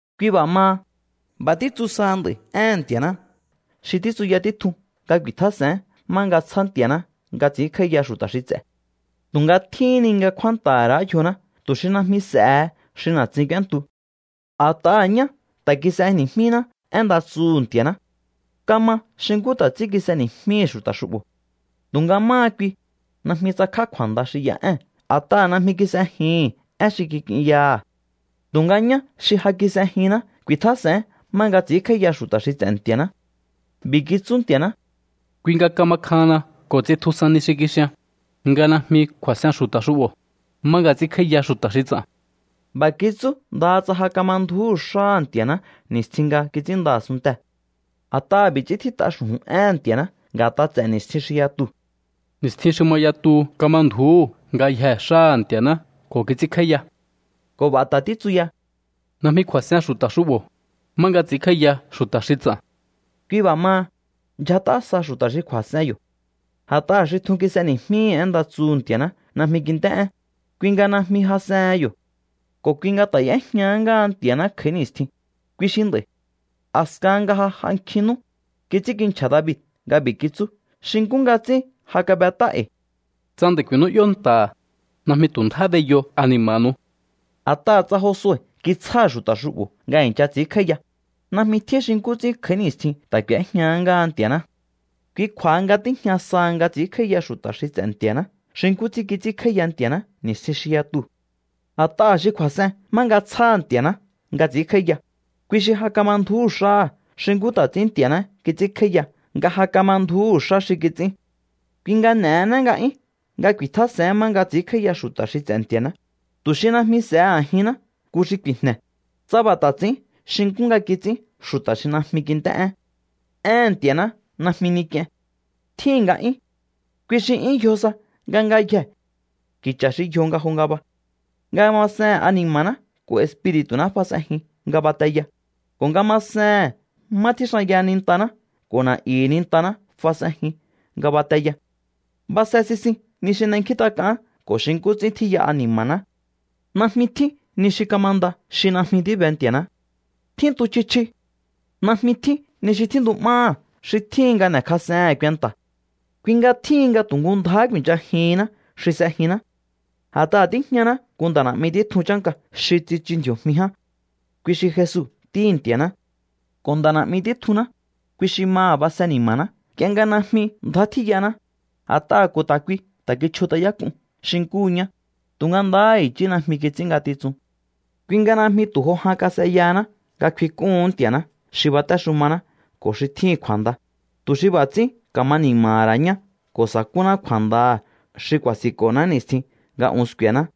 Kui b'a̱ maha, b'a̱ títsu saha nd'a̱i̱ éhe̱n Nti̱a̱ná xi títsuya títjun nga ku̱i̱tjás'e̱én má nga tsjá Nti̱a̱ná nga ts'i̱ínkj'áíya xu̱ta̱ xi ts'e̱. Tu̱nga tjíhín ni nga kjúánta̱ha̱ ra̱á yjoná tu̱ xi najmi s'e̱he xi na̱tsin k'úéntu. A̱t'aha̱ ñá ta̱ kis'eni̱jmíná én nda tsuhu̱ Nti̱a̱ná. Kama xi nkú ta̱ ts'ín kis'eni̱jmíhi̱ xu̱ta̱ xu'bo̱. Tu̱nga máha kui, najmi tsakj'á kju̱a̱nda xi y'a ée̱n a̱t'aha̱ najmi kis'ejihi̱n én xi kik'inyaha̱. Tu̱nga ñá xi ja kis'ejinná ku̱i̱tjás'e̱én má nga ts'i̱ínkj'áíya xu̱ta̱ xi ts'e̱ Nti̱a̱ná. B'i̱ kitsú Nti̱a̱ná: Kui nga kama kjahanna ko̱ ts'intjusan ni xi kixian, nga najmi kju̱a̱s'en xu̱ta̱ xu'bo̱, má nga ts'ínkj'áíya xu̱ta̱ xi ts'a̱n. B'a̱ kitsú ndaha tsa ja kama ndju̱úhu̱ xáha̱ Nti̱a̱ná ni̱stjin nga kits'ínnda a̱sunntee̱. A̱t'aha̱ b'i̱ ts'ín tjít'a xu̱ju̱n éhe̱n Nti̱a̱ná nga̱t'a ts'e̱ ni̱stjin xi yatuu̱: Ni̱stjin xi ma yatuhu kama ndju̱úhu̱ ngayjee̱ xáha̱ Nti̱a̱ná ko̱ kits'ínkj'áíya. Ko̱ b'a̱ ta̱ títsu ya: Najmi kju̱a̱s'en xu̱ta̱ xu'bo̱, má nga ts'i̱ínkj'áíya xu̱ta̱ xi ts'a̱n. Kui b'a̱ maha, ndyjat'a sa xu̱ta̱ xi kju̱a̱s'en yo̱. A̱t'aha̱ xi tjun kis'eni̱jmíhi̱ én nda tsuhu̱ Nti̱a̱ná najmi kint'é'én, kui nga najmi jas'ehen yo̱. Ko̱ kui nga ta̱ y'éjñahá ngáha Nti̱a̱ná kj'a̱í ni̱stjin, kui xi nd'a̱i̱. A̱skahan nga ja j'a nkjin nú, kits'ínkinchja̱ David nga b'i̱ kitsú xi nkú nga ts'ín ja kab'et'á e̱i̱: Tsa nd'a̱i̱ ku̱i̱nú'yó nta̱ha̱, najmi tu̱ ndjá b'eyo ani̱ma̱nu̱u. A̱t'aha̱ tsa Josue kitsjáha̱ xu̱ta̱ xu'bo̱ nga i̱ncha ts'i̱ínkj'áíya, najmi tjín xi nkú ts'ín kj'a̱í ni̱stjihin ta̱ k'u̱éjña ngáha Nti̱a̱ná. Kui kju̱a̱ha nga tíjña sa nga ts'i̱ínkj'áíya xu̱ta̱ xi ts'e̱ Nti̱a̱ná xi nkú ts'ín kits'ínkj'áíya Nti̱a̱ná ni̱stjin xi yatuu̱. A̱t'aha̱ xi kju̱a̱s'en má nga tsjáha̱ Ntia̱ná nga ts'i̱ínkj'áíya, kui xi ja kama ndju̱úhu̱ xáha̱ xi nkú ta̱ ts'ín Nti̱a̱ná kits'ínkj'áíya nga ja kama ndju̱úhu̱ xá xi kits'ín. Kui nga n'e̱hená nga'yún nga ku̱i̱tjás'e̱én má nga ts'i̱ínkj'áíya xu̱ta̱ xi ts'e̱ Nti̱a̱ná, tu̱ xi najmi s'e̱he a̱jinná nku xi ku̱i̱jne̱, tsa b'a̱ ta̱ ts'i̱ín xi nkú nga kits'ín xu̱ta̱ xi najmi kint'é'én. Éhe̱n Nti̱a̱ná najmi ni k'ien. Tjíhi̱n nga'yún. Kui xi 'yún yjo sa nga ngayjee̱ ki̱cha̱ xi yjo nga jo ngaba. Nga masehe̱n ani̱ma̱ná ko̱ espiri̱tu̱ná fas'enjin nga bateya, ko̱ nga masehe̱n má tjíxanyaha̱ nintaná ko̱ na̱'yu̱hu̱ nintaná fas'enjin nga bateya. Base sisin ni xi n'enkjíntak'aán ko̱ xi nkú ts'ín tjíya ani̱ma̱ná. Najmi tjín ni xi kamanda xi najmi tíbe Nti̱a̱ná. Tjíntu chji chji. Najmi tjín ni xi tjíntu'máha̱ xi tjíhin nga n'e̱kjas'ehe̱én kuenta̱. Kui nga tjíhin nga tu̱ nku ndjáhá ku̱i̱nchajihinná xi s'ejinná. A̱t'aha̱ tíjñaná nku nda̱ na̱'mi títjun chánka xi tsichu ndji̱o̱jmi ján, kui xi Jesu Ntíhi̱ Nti̱a̱ná. Ko̱ Nda̱ na̱'mi títjunná, kui xi maha̱ base ni̱ma̱ná nk'ie nga najmi ndjá tjíyaná, a̱t'aha̱ ko̱ ta̱ kui ta̱ kichjut'ayák'un xi nkúhu ñá, tu̱nga ndahá i̱chí najmi kits'ín ngatitsun. Kui nga najmi tu̱ jo jan kas'eyahaná nga kfink'úhu̱ún Nti̱a̱ná xi batéxumaná ko̱ xi tjíhi̱n kju̱a̱nda, tu̱ xi b'a̱ ts'ín ka̱ma ni̱ma̱ha̱ ra̱ ñá ko̱ sa̱kúná kju̱a̱ndaha̱ xi ku̱a̱si̱nko̱ná ni̱stjin nga un sku̱e̱ná.